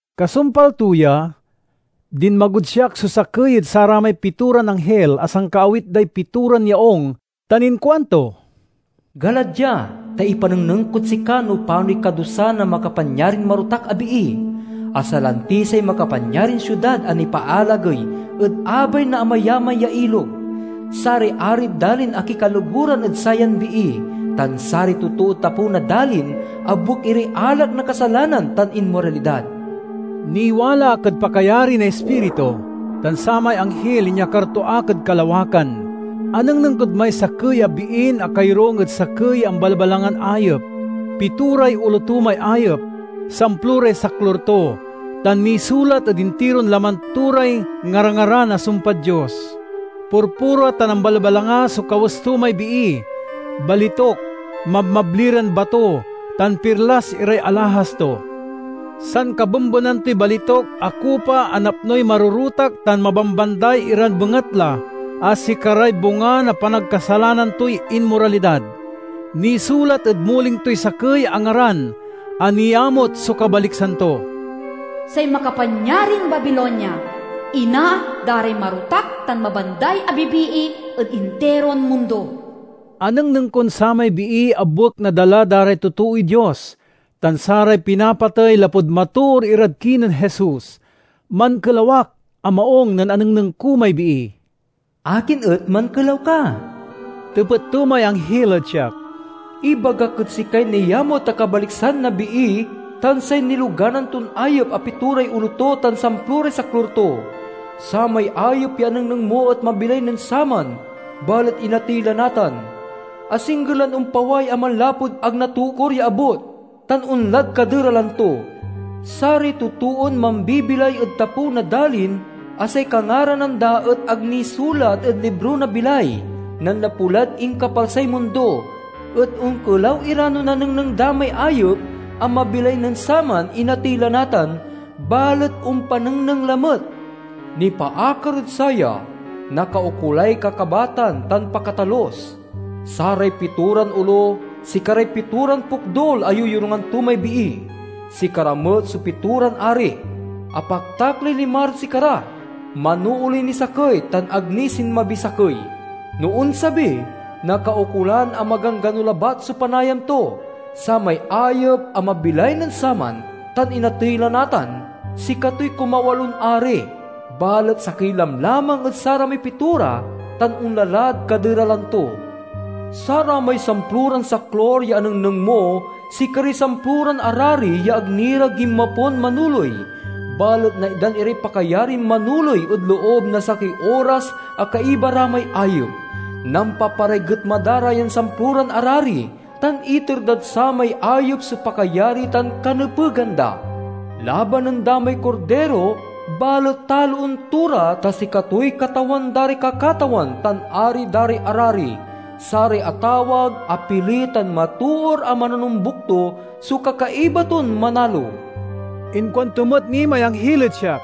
Kasumpal to ya, dinmagod siak so sakey ed saramay pitoran anghil a sankaawit day pitoran yaung tan inkuanto, "Gala dia, ta ipanengneng kod sika no panoy kadusa na makapanyarin marotak a bii, a salanti say makapanyarin siudad a nipaalagey ed abay na amayamay ya ilog. Saray arid dalin akikaloguran ed sayan bii, tan saray totood tapew na dalin abuek iray alak na kasalanan tan inmoralidad." Niwala ak ed pakayari na Ispiritu, tan samay anghil inyakar to ak ed kalawakan. Anengneng kod may sakey a biin akayorung ed sakey ya ambalbalangan ayep. Pitoray olo to may ayep, samploray saklur to, tan nisulat ed intiron laman to ray ngarangaran a sumpad Dios. Purpura tan ambalbalanga so kawes to may bii. Balituk, mabmabli ran bato, tan pirlas iray alahas to. Sankabembenan toy balituk a kupa a napnoy marorotak tan mabambanday iran bengatla a sikaray bunga na panagkasalanan toy inmoralidad. Nisulat ed muling toy sakey a ngaran a niamut so kabaliksan to: "Say Makapanyarin Babilonia, ina da ray marotak tan mabanday a bibii ed intiron mundo." Anengneng kon samay bii abuek na dala da ray totooy Dios tan saray pinapatey lapud matoor irad kinen Jesus. Mankelaw ak a maung nen anengneng ko may bii. "Akin et mankelaw ka?" tepet to may anghil ed siak. "Ibagak ed sikay niamut a kabaliksan na bii tan say niloganan ton ayep a pitoray olo to tan samploray saklur to. Samay ayep ya anengneng mo et mabilay nen saman, balet inatey la natan. Asingger lan ompaway a manlapud ag natokur ya abut, tan onlad kaderalan to. Saray totoon mambibilay ed tapew na dalin a say kangaranan da et ag nisulat ed libro na bilay, nanlapu lad inkapalsay mundo, et onkelaw ira no nanengneng da may ayep a mabilay nen saman, inatey la natan, balet ompanengneng lamet. "Nipaakar ed saya, nakaukolay kakabatan tan pakatalus. Saray pitoran olo sikaray pitoran pokdul a yoyorungan to may bii. Sikara met so pitoran ari; apaktak lay limarad sikara, manooley niy sakey, tan ag ni sinmabiy sakey. No onsabi, nakaukolan a maganggano labat so panayam to. Samay ayep a mabilay nen saman tan inatey la natan, sikatoy kumawalon ari, balet sakey lamlamang ed saramay pitora, tan onla lad kaderalan to. "Saramay samploran saklur ya anengneng mo sikaray samploran arari ya ag ni ra ginmapon manoley, balet naitdan iray pakayarin manoley ed loob na sakey oras a kaiba ra may ayep. Nampaparay getma da ra yan samploran arari, tan iter dad samay ayep so pakayari tan kanepegan da. Labanan da may Kordiro balet taloen to ra, ta sikatoy Katawan da ray kakatawan tan Ari da ray arari. Saray atawag, apili, tan matoor a mananombuk to so kakaiba ton manalo." Inkuanto met ni may anghil ed siak,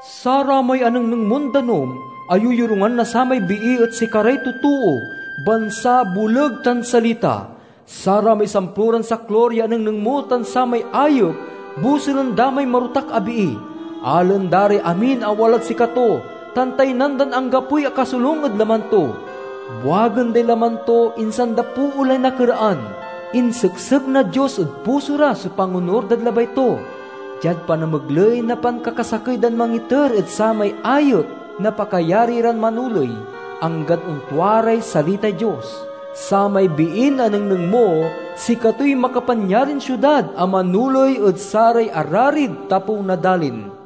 "Saramay anengneng mon danum a yoyorungan na samay bii et sikaray totoo, bansa, boleg, tan salita. Saramay samploran saklur ya anengneng mo tan samay ayep bosulen da may marotak a bii. Alaen da ray amin a walad sikato, tan taynan dan anggapoy akasolung ed laman to. Buagen day laman to, insan da poolay nakeraan. Inseksek na Dios ed puso ra so pangonur dad labay to, diad panamegley na pankakasakey dan mangiter ed samay ayep na pakayari ran manoley, anggad ontua ray salitay Dios. "Samay biin anengneng mo sikatoy makapanyarin siudad a manoley ed saray ararid tapew na dalin."